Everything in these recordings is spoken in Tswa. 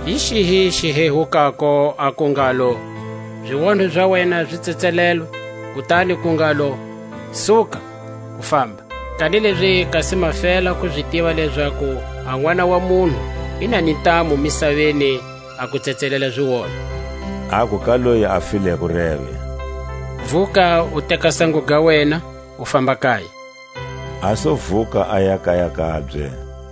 Hi xihi xihehukako, aku ngalo: Zionho za wena zi tsetselelwe; kutani ku ngalo: Suka, u famba? Kanilezi kasi ma fela ku zi tiva lezaku a Nʼwana wa munhu i nani ntamu misaveni a ku tsetselela zionho, (aku ka loyi a fileko reve): Vuka, u teka sango ga wena, u famba kaya; A su vuka, aya kaya kabye.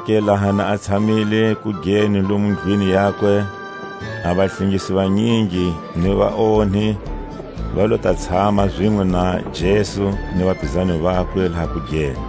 Zonake laha na a tshamile kugeni lomu ndlwini yakwe, a vahlengisi vanyingi ni vaonhi va lo ta tshama zinwe na Jesu ni vapizani vakwe laha kugeni.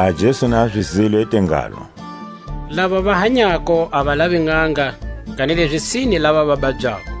Laha Jesu na zi zwile, i te ngalo: Lava va hanyako a va lavi nʼanga, kanilezi sine lava va babyako.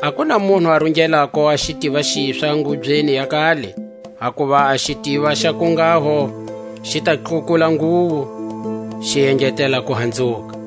A ku na munhu a rungelako a xitiva xiswa ngubyeni ya kale, hakuva a xitiva xa kunghaho xi nga tlhukula nguwo, xi engetela kuhanzuka.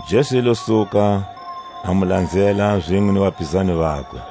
Jesu i lo suka, a mu lanzela zinwe ni vapizani vakwe.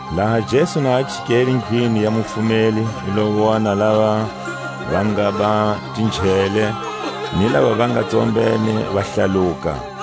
Laha Jesu na a chikelendlwini ya mufumeli, i lo wona lava va ngaba tinjhele, ni lava va nga tsombene va hlaluka,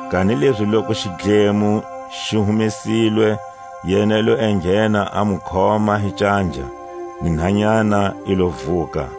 Kanilezi loku xidlemo xi humesilwe, yena i lo enghena, a mu khoma hi canja; ni nhanyana i lo vuka.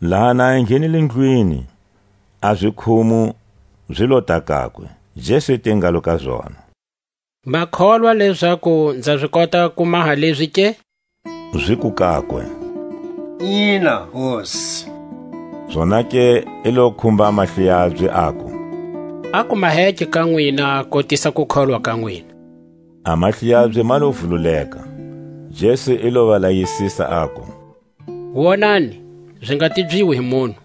Laha na a enghenile ndlwini, a zikhumu zi lota kakwe. Jesu i te ngalo ka zona: Ma kholwa lezaku nza zi kota ku maha leʼzi ke? Ziku kakwe: Ina, Hosi. Zonake i lo khumba a mahlo yabye, aku: A ku maheke ka nwina kotisa kukholwa ka nwina. A mahlo yabye ma lo vululeka. Jesu i lo va layisisa, aku: Wonani, zi nga tibyiwi hi munhu.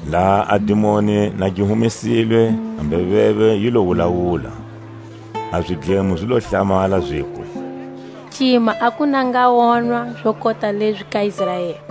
Laha a dimoni na gi humesilwe, a mbeveve yi lo wulawula. A zidlemo zi lo hlamala, ziku: Cima a ku na nga wonwa zo kota lezi ka Israeli!